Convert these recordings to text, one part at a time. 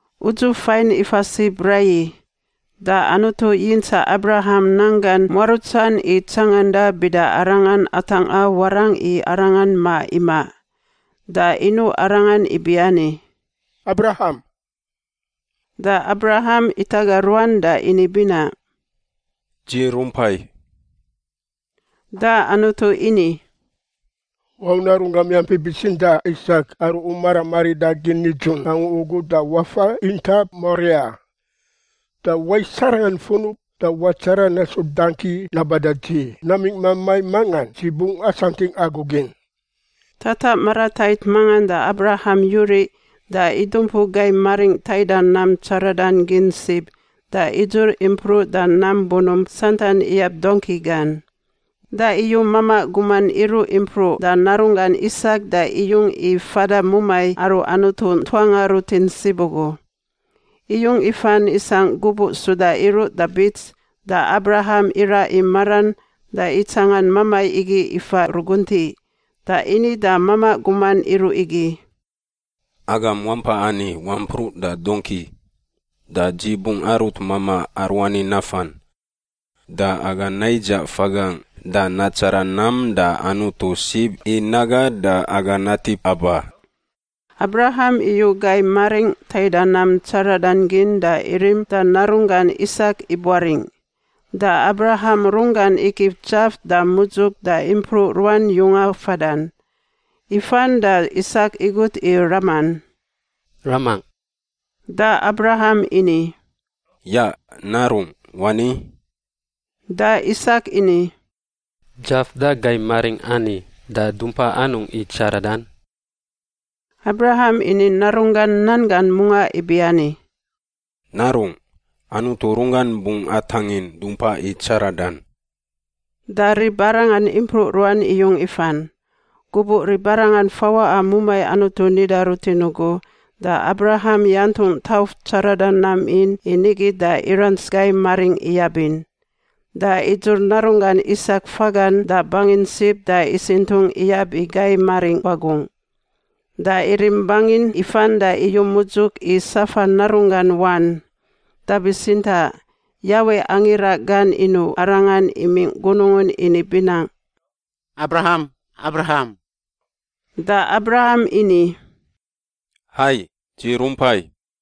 Udzuf fain ifa sib raiyi, da Anutu yintsaꞌ Abraham nanggan muarutsan i tsanganda bida arangan atangꞌa warangꞌ i Arangan ma imaꞌ. Da inuꞌ arangan ibiani, “Abraham!” Da Abraham itaga ruan da ini binaꞌ, “Dzi rumpai.” Da Anutu ini, “Wau narunggam yampi bitsintaꞌ Isak aru u maram aridagin nidzun angu ugu da wafa intap Moria. Da wais arangan funub da watsara nasu dangki naba da Dzi namingꞌ mamai mangan Dzi bungꞌ asantingꞌ agu gin.” Tataꞌ maratait mangan da Abraham yuriꞌ da idumpu gai maringꞌ taida nam tsaradan gin sib da idzur impruꞌ da nam bunump santan iyab dongki gan. Da iyu mamaꞌ guman iruꞌ impruꞌ da narunggan Isak da iyung i fada mumai aru Anutu ntuanga rutin sib ugu. Iyung ifan isangꞌ gubuꞌ suda iruꞌ da bits da Abraham iraꞌ i maran da itsangan mamai igi ifa ruguntiꞌ. Da ini da mamaꞌ guman iruꞌ igi, “Agam wampa ani wampruꞌ da dongki, da dzi bungꞌ arut mamaꞌ aruani nafan. Da aga naidzaꞌ fagangꞌ da natsara nam da Anutu sib i naga da aga natip aba.” Abraham iyu gai maringꞌ taida nam tsaradan gin da irim da narunggan Isak ibuaringꞌ. Da Abraham runggan igif dzaf da mudzuk da impruꞌ ruan yunga fadan. Ifan da Isak igut i raman, “Ramangꞌ?” Da Abraham ini, “Yaꞌ, narungꞌ. Wani.” Da Isak ini, “Dzaf da gai maringꞌ ani, da dumpa anungꞌ i tsaradan?” Abraham ini narunggan nan gan mungaꞌ ibiani, “Narungꞌ, Anutu runggan bungꞌ atangin dumpa i tsaradan.” Da ribarangan impruꞌ ruan iyung ifan. Gubuꞌ ribarangan fawaꞌa mumai Anutu nida rutin ugu, da Abraham yantungꞌ tauf tsarada nam in i nigi da irants gai maringꞌ iyabin. Da idzur narunggan Isak fagan da bangin sib da isintungꞌ iyab i gai maringꞌ wagungꞌ. Da irim bangin ifan da iyu mudzuk i safa narunggan wan. Da bitsintaꞌ Yawe angira gan inuꞌ arangan imingꞌ gunungun ini binaꞌ, “Abraham! Abraham!” Da Abraham ini, “Hai. Dzi rumpai.”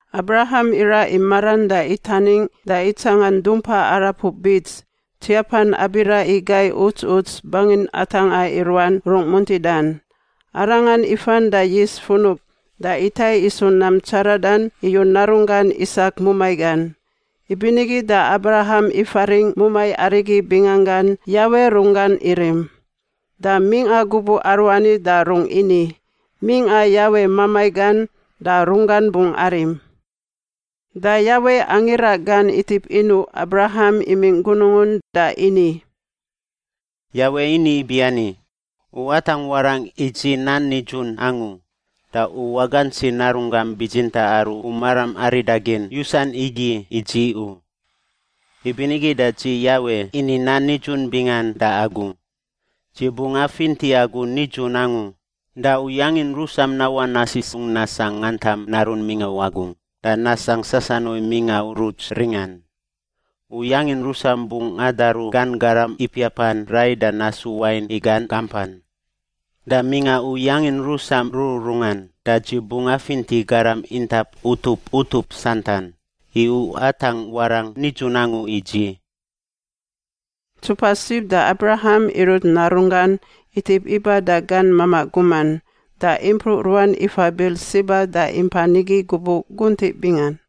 Abraham iraꞌ i maran da itaningꞌ da itsangan dumpa arapuꞌ bits, tsiapan abira i gai uts uts bangin atangꞌa i ruan rung muntidan. Arangan ifan da yis funub da itai isu nam tsaradan iyu narunggan Isak mumai gan. Ibinigi da Abraham ifaringꞌ mumai arigi bingangan Yawe Runggan Irim. Da mingꞌa gubuꞌ aruani da rungꞌ ini, “Mingꞌa Yawe mamai gan da Runggan bungꞌ arim.” Da Yawe angira gan itip inuꞌ Abraham imingꞌ gunungun da ini, “Yawe ini ibiani, ‘U atangꞌ warangꞌ i Dzi nan nidzun angu da u wagantsi narunggam bitsintaꞌ aru u maram aridagin yusan igi i Dzi u. Ibinigi da dzi Yawe ini nan nidzun bingan da agu: Dzi bungꞌ afinti agu nidzun angu da u yangin rusam nawaꞌ nasisungꞌ nasangꞌ ngantam narun mingꞌa wagungꞌ da nasangꞌ sasanuai mingꞌa uruts ringan. U yangin rusam bungꞌ adaru gan garam ipiapan rai da nasu wain i gan gampan. Da mingꞌa u yangin rusam rururungan da Dzi bungꞌ afinti garam intap utup utup santan, i u atangꞌ warangꞌ nidzun angu i Dzi.’” Ntsupa sib da Abraham irut narunggan itip iba da gan mamaꞌ guman, da impruꞌ ruan ifa Birsiba da impa nigi gubuꞌ guntiꞌ bingan.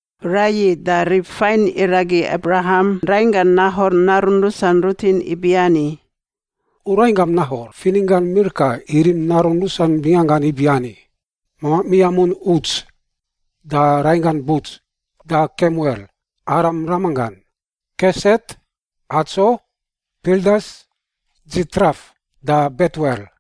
Raiyi da rib fain iragi Abraham rainggan Nahor narun rusan rutin ibiani, “U rainggam Nahor fininggan Milka irim narun rusan binganggan ibiani: mamaꞌ miamun Uts, da rainggan Buts, da Kemuel— Aram ramanggan, Keset, Hatso, Pildas, Dzitraf da Betuel.”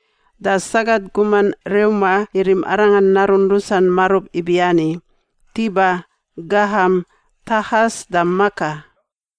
Da sagat guman Reuma irim arangan narun rusan marub ibiani: Tiba, Gaham, Tahas da Maka.